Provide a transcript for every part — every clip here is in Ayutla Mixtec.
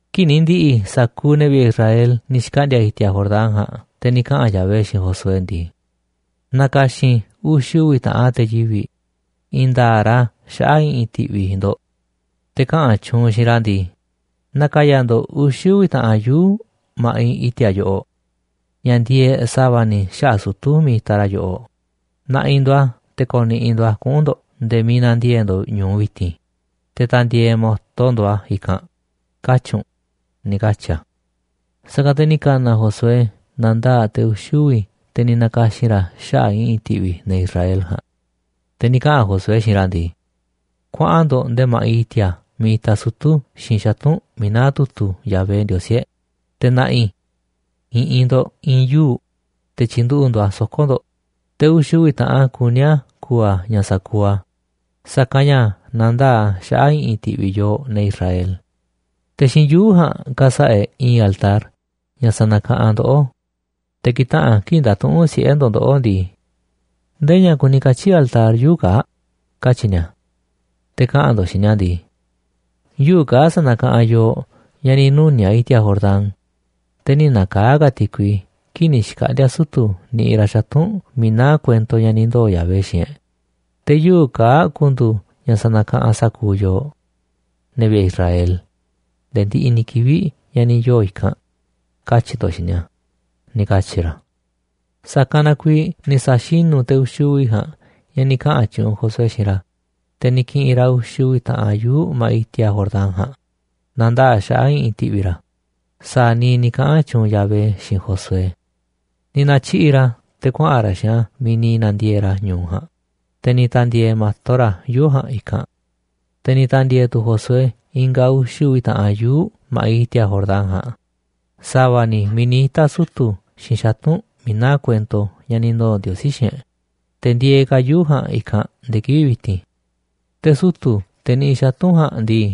Kii̱ꞌ ni̱ ndi̱ꞌi̱ sa̱kuuꞌ ne̱ vi̱ꞌe̱ Israel ni̱ xkaꞌndi̱a̱ i̱ti̱a̱ Jordán ja̱a̱nꞌ, te̱ ni̱ kaꞌa̱n Yahvé xiinꞌ Josué ndii: ―Na̱ka̱xi̱n uxi̱ uvi̱ taꞌan te̱ yivi̱ꞌ, i̱i̱n nda̱a̱ꞌ ra̱ xaꞌa̱ꞌ i̱ꞌi̱n ti̱ꞌvi̱ ndo̱ꞌ. Te̱ kaꞌa̱n tyuunꞌ u̱nꞌ xiinꞌ ra̱ ndii: “Na̱ka̱ya̱ ndo̱ꞌ uxi̱ uvi̱ taꞌan yuu̱ꞌ ma̱ꞌiꞌ i̱ti̱a̱ yoꞌoꞌ ña̱ ndieeꞌ sa̱va̱ ni̱ xaꞌa̱ꞌ sutu̱ miiꞌ itaꞌ ra̱ yoꞌoꞌ, na̱ꞌi̱ ndo̱ꞌ a̱ te̱ ko̱ni̱ꞌi̱ ndo̱ꞌ a̱ kuꞌu̱n ndo̱ꞌ nde̱e̱ miiꞌ na̱ndiee̱ꞌ ndo̱ꞌ ñu̱u vi̱ti̱n, te̱ ta̱ndi̱e̱e̱ mo̱to ndo̱ꞌ a̱ i̱kanꞌ”, katyi̱ u̱nꞌ ―ni̱ katyi̱ a. Sa̱kanꞌ te̱ ni̱ ka̱na̱ Josué na̱ndaa̱ꞌ te̱ uxi̱ uvi̱ te̱ ni̱ na̱ka̱xi̱n ra̱ xaꞌa̱ꞌ i̱ꞌi̱n ti̱ꞌvi̱ ne̱ Israel ja̱a̱nꞌ. Te̱ ni̱ kaꞌa̱n Josué xiinꞌ ra̱ ndii: ―Kuaꞌan ndo̱ꞌ nde̱e̱ ma̱ꞌiꞌ i̱ti̱a̱ miiꞌ itaꞌ sutu̱ xiinꞌ xatu̱nꞌ miiꞌ naá tu̱tu̱ Yahvé, Ndiosí e̱ꞌ, te̱ na̱ꞌi̱ i̱ꞌi̱n ndo̱ꞌ i̱i̱n yuu̱ꞌ, te̱ tyi̱nduꞌu̱ꞌ ndo̱ꞌ a̱ soko̱ ndo̱ꞌ, te̱ uxi̱ uvi̱ taꞌan kuní a̱ ku̱u̱ a̱ ña̱ sa̱kuuꞌ a̱, sa̱kanꞌ ña̱ na̱ndaa̱ꞌ a̱ xaꞌa̱ꞌ i̱ꞌi̱n ti̱ꞌvi̱ yooꞌ, ne̱ Israel. Te̱ xiinꞌ yuu̱ꞌ ja̱a̱nꞌ ka̱sa̱ꞌa̱ e̱ꞌ i̱i̱n altar ña̱ sa̱na̱kaꞌanꞌ ndoꞌó. Te̱ ki̱taꞌa̱n kii̱ꞌ nda̱tuꞌu̱nꞌ siꞌe̱ ndo̱ꞌ ndoꞌó ndii: “¿Ndee ña̱ kuni katyi̱ altar yuu̱ꞌ kaa̱ꞌ?”, katyi̱ ni̱a̱. Te̱ kaꞌa̱n ndo̱ꞌ xiinꞌ ni̱a̱ ndii: “Yuu̱ꞌ kaa̱ꞌ sa̱na̱kaꞌanꞌ yooꞌ ña̱ ni̱ nuni̱a̱ꞌ i̱ti̱a̱ Jordán, te̱ nï̱ na̱kaa̱ꞌ ka̱ ti̱kui kii̱ꞌ ni̱ xkaꞌndi̱a̱ sutu̱ niꞌiꞌ ra̱ xatu̱nꞌ miiꞌ naá kuento ña̱ ni̱ ndoo̱ Yahvé xiinꞌ e̱ꞌ, te̱ yuu̱ꞌ kaa̱ꞌ ku̱ndu̱u̱ ña̱ sa̱na̱kaꞌanꞌ sa̱kuuꞌ yooꞌ, ne̱ vi̱ꞌe̱ Israel, nde̱e̱ ndiꞌiꞌ ni̱ kivi̱ꞌ ña̱ ni̱ yoo̱ i̱kanꞌ”, katyi̱ ndo̱ꞌ xiinꞌ ni̱a̱ ―ni̱ katyi̱ ra̱. Sa̱kanꞌ na kuiiꞌ ni̱ sa̱xinu̱ te̱ uxi̱ uvi̱ ja̱a̱nꞌ ña̱ ni̱ kaꞌa̱n tyuunꞌ Josué xiinꞌ ra̱, te̱ ni̱ ki̱ꞌi̱n ra̱ uxi̱ uvi̱ taꞌan yuu̱ꞌ ma̱ꞌiꞌ i̱ti̱a̱ Jordán ja̱a̱nꞌ, na̱ndaa̱ꞌ a̱ xaꞌa̱ꞌ i̱ꞌi̱n ti̱ꞌvi̱ ra̱, sa̱a̱ niiꞌ ni̱ kaꞌa̱n tyuunꞌ Yahvé xiinꞌ Josué. Ni̱ na̱tyiꞌi̱ꞌ ra̱ a̱ te̱ kuaꞌa̱n ra̱ xiinꞌ a̱ miiꞌ ni̱ na̱ndiee̱ꞌ ra̱ ñu̱u ja̱a̱nꞌ, te̱ ni̱ ta̱ndi̱e̱e̱ mo̱to ra̱ yuu̱ꞌ ja̱a̱nꞌ i̱kanꞌ. Te̱ ni̱ ta̱ndi̱e̱e̱ tu̱ Josué i̱nga̱ uxi̱ uvi̱ taꞌan yuu̱ꞌ ma̱ꞌiꞌ i̱ti̱a̱ Jordán ja̱a̱nꞌ, sa̱va̱ ni̱ miiꞌ ni̱ ita̱ sutu̱ xiinꞌ xatu̱nꞌ miiꞌ naá kuento ña̱ ni̱ ndoo̱ Ndiosí xiinꞌ e̱ꞌ, te̱ ndieeꞌ ka̱ yuu̱ꞌ ja̱a̱nꞌ i̱kanꞌ nde̱e̱ kivi̱ꞌ vi̱ti̱n. Te̱ sutu̱, te̱ niꞌiꞌ xatu̱nꞌ ja̱a̱nꞌ ndii,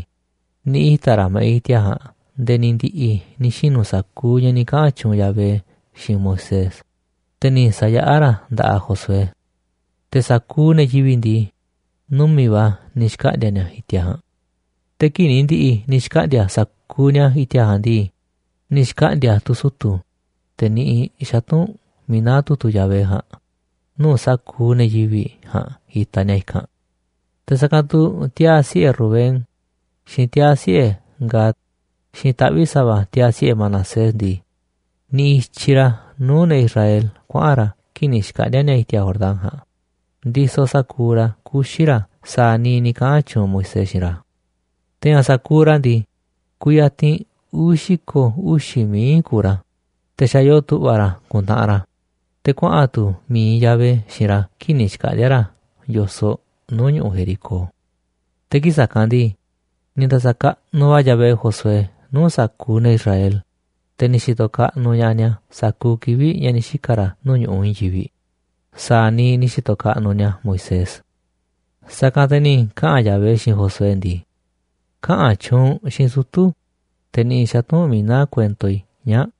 ni̱ ita̱ ra̱ ma̱ꞌiꞌ i̱ti̱a̱ ja̱a̱nꞌ nde̱e̱ ni̱ ndi̱ꞌi̱ ni̱ xinu̱ sa̱kuuꞌ ña̱ ni̱ kaꞌa̱n tyuunꞌ Yahvé xiinꞌ Moisés, te̱ ni̱ sa̱yaꞌá ra̱ nda̱ꞌaꞌ Josué. Te̱ sa̱kuuꞌ ne̱ yivi̱ꞌ ndii, numi̱ꞌ va̱ ni̱ xkaꞌndi̱a̱ ni̱a̱ i̱ti̱a̱ ja̱a̱nꞌ. Te̱ kii̱ꞌ ni̱ ndi̱ꞌi̱ ni̱ xkaꞌndi̱a̱ sa̱kuuꞌ ni̱a̱ i̱ti̱a̱ ja̱a̱nꞌ ndii, ni̱ xkaꞌndi̱a̱ tu̱ sutu̱, te̱ niꞌiꞌ xatu̱nꞌ miiꞌ naá tu̱tu̱ Yahvé ja̱a̱nꞌ, nuu̱ꞌ sa̱kuuꞌ ne̱ yivi̱ꞌ ja̱a̱nꞌ itaꞌ ni̱a̱ i̱kanꞌ. Te̱ sa̱kanꞌ tu̱ tiaa̱ siꞌe̱ Rubén, xiinꞌ tiaa̱ siꞌe̱ Gad, xiinꞌ taꞌvi̱ꞌ sa̱va̱ tiaa̱ siꞌe̱ Manasés ndii, niꞌiꞌ i̱tyiꞌ ra̱ nuu̱ꞌ ne̱ Israel kuaꞌa̱n ra̱ kii̱ꞌ ni̱ xkaꞌndi̱a̱ ni̱a̱ i̱ti̱a̱ Jordán ja̱a̱nꞌ, ndisoꞌ sa̱kuuꞌ ra̱ kuxi̱ ra̱ sa̱a̱ niiꞌ ni̱ kaꞌa̱n tyuunꞌ Moisés xiinꞌ ra̱. Te̱ ña̱ sa̱kuuꞌ ra̱ ndii, kuyatinꞌ uvi̱ xi̱ko̱ mií kuuꞌ ra̱, te̱ xa̱ yoo tu̱ꞌva̱ ra̱ te̱ ku̱ntaꞌanꞌ ra̱, te̱ kuaꞌa̱n tu̱ mi̱iꞌ Yahvé xiinꞌ ra̱ kii̱ꞌ ni̱ xkaꞌndi̱a̱ ra̱ yo̱soꞌ nuu̱ꞌ ñu̱ꞌuꞌ Jericó. Te̱ kii̱ꞌ sa̱kanꞌ ndii, ni̱ nda̱sa̱kaꞌnuꞌ va̱ Yahvé Josué nuu̱ꞌ sa̱kuuꞌ ne̱ Israel, te̱ ni̱ xi̱to̱ kaꞌnuꞌ ña̱ꞌaꞌ ni̱a̱ sa̱kuuꞌ kivi̱ꞌ ña̱ ni̱ xika̱ ra̱ nuu̱ꞌ ñu̱ꞌuꞌ i̱i̱n yivi̱ꞌ, sa̱a̱ niiꞌ ni̱ xi̱to̱ kaꞌnuꞌ ni̱a̱ Moisés. Sa̱kanꞌ te̱ ni̱ kaꞌa̱n Yahvé xiinꞌ Josué ndii: ―Kaꞌa̱n tyuunꞌ u̱nꞌ xiinꞌ sutu̱, te̱ niꞌiꞌ xatu̱nꞌ miiꞌ naá kuento i̱ ñaa̱ꞌ,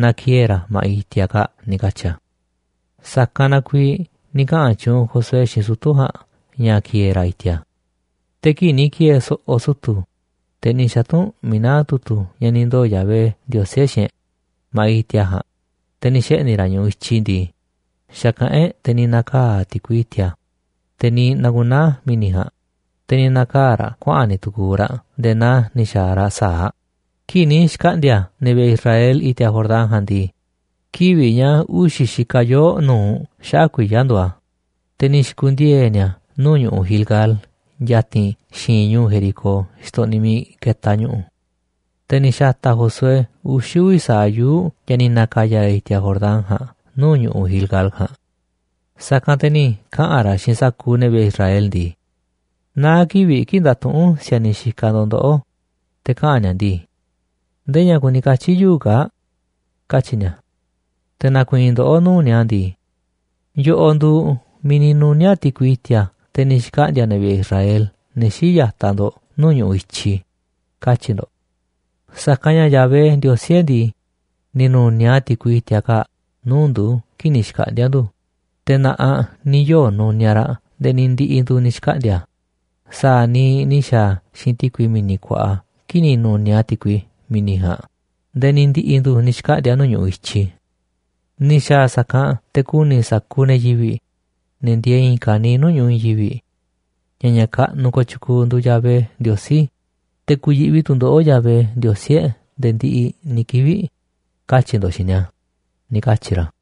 na ki̱e̱e̱ ra̱ ma̱ꞌiꞌ i̱ti̱a̱ kaa̱ꞌ ―ni̱ katyi̱ a̱. Sa̱kanꞌ na kuiiꞌ ni̱ kaꞌa̱n tyuunꞌ Josué xiinꞌ sutu̱ ja̱a̱nꞌ ña̱ ki̱e̱e̱ ra̱ i̱ti̱a̱. Te̱ kii̱ꞌ ni̱ ki̱e̱e̱ so̱ꞌo̱ sutu̱, te̱ niꞌiꞌ xatu̱nꞌ miiꞌ naá tu̱tu̱ ña̱ ni̱ ndoo̱ Yahvé, Ndiosí e̱ꞌ, xiinꞌ e̱ꞌ ma̱ꞌiꞌ i̱ti̱a̱ ja̱a̱nꞌ, te̱ ni̱ xeꞌni̱ ra̱ ñu̱ꞌuꞌ i̱tyi ndii, xa̱kaꞌánꞌ e̱ꞌ, te̱ ni̱ na̱kaa̱ꞌ ti̱kui i̱ti̱a̱, teꞌ ni̱ xku̱naa̱ mi̱ni̱ ja̱a̱nꞌ, te̱ ni̱ na̱kaa̱ raꞌ kuaꞌa̱n ni̱ tu̱ku̱u̱ raꞌ nde̱e̱ naa ni̱ xa̱a̱ raꞌ sa̱aꞌ. Kii̱ꞌ ni̱ xkaꞌndi̱a̱ ne̱ vi̱ꞌe̱ Israel i̱ti̱a̱ Jordán ja̱a̱nꞌ ndii, kivi̱ꞌ ña̱ uxi̱ xikaꞌ yoo̱ꞌ nu̱uꞌ xaꞌa̱ꞌ kuiya̱ nduuꞌ a̱, te̱ ni̱ xi̱ku̱ndiee̱ ni̱a̱ nuu̱ꞌ ñu̱ꞌuꞌ Gilgal ya̱ti̱n xi̱i̱nꞌ ñu̱u̱ Jericó xtoꞌniꞌ miiꞌ ketaꞌ ñu̱ꞌu̱. Te̱ ni̱ xa̱ta̱ Josué uxi̱ uvi̱ sa̱aꞌ yuu̱ꞌ ña̱ ni̱ na̱ka̱ya̱ ra̱ i̱ti̱a̱ Jordán ja̱a̱nꞌ nuu̱ꞌ ñu̱ꞌuꞌ Gilgal ja̱a̱nꞌ. Sa̱kanꞌ te̱ ni̱ kaꞌa̱n ra̱ xiinꞌ sa̱kuuꞌ ne̱ vi̱ꞌe̱ Israel ndii: ―Naá kivi̱ꞌ kii̱ꞌ nda̱tuꞌu̱nꞌ si̱a̱niꞌ xikaꞌ ndo̱ꞌ ndoꞌó, te̱ kaꞌa̱n ni̱a̱ ndii: “¿Ndee ña̱ kuni katyi̱ yuu̱ꞌ kaa̱ꞌ?”, katyi̱ ni̱a̱. Te̱ na̱ku̱i̱i̱n ndoꞌó nuu̱ꞌ ni̱a̱ ndii: “Yoꞌoꞌ nduuꞌ miiꞌ ni̱ nuni̱a̱ꞌ ti̱kui i̱ti̱a̱, te̱ ni̱ xkaꞌndi̱a̱ ne̱ vi̱ꞌe̱ Israel, ne̱ xii̱ꞌ ya̱taꞌ ndo̱ꞌ, nuu̱ꞌ ñu̱ꞌuꞌ i̱tyi”, katyi̱ ndo̱ꞌ. Sa̱kanꞌ ña̱ Yahvé, Ndiosí e̱ꞌ ndii, ni̱ nu̱niaꞌ a̱ ti̱kui i̱ti̱a̱ kaa̱ꞌ nuu̱ꞌ ndu̱ kii̱ꞌ ni̱ xkaꞌndi̱a̱ ndu̱, te̱ na̱ꞌaꞌ ni̱ yoo̱ nuniaꞌ raꞌ nde̱e̱ ni̱ ndi̱ꞌi̱ ndu̱ ni̱ xkaꞌndi̱a̱, sa̱a̱ niiꞌ ni̱ xa̱a̱ a̱ xiinꞌ ti̱kui Mi̱ni̱ Kuaꞌa kii̱ꞌ ni̱ nu̱niaꞌ a̱ ti̱kui mi̱ni̱ ja̱a̱nꞌ nde̱e̱ ni̱ ndi̱ꞌi̱ ndu̱ ni̱ xkaꞌndi̱a̱ nuu̱ꞌ ñu̱ꞌuꞌ i̱tyiꞌ. Ni̱ xa̱a̱ a̱ sa̱kanꞌ te̱ ku̱ni̱ sa̱kuuꞌ ne̱ yivi̱ꞌ, ne̱ ndieeꞌ i̱i̱n ka̱niiꞌ nuu̱ꞌ ñu̱ꞌuꞌ i̱i̱n yivi̱ꞌ, ña̱ ña̱ kaꞌnuꞌ kooꞌ tyukuuꞌ nduuꞌ Yahvé Ndiosí, te̱ ku̱yi̱ꞌvi tu̱ ndoꞌó Yahvé, Ndiosí e̱ꞌ, nde̱e̱ ndiꞌiꞌ, katyi̱ ndo̱ꞌ xiinꞌ ni̱a̱ ―ni̱ katyi̱ ra̱.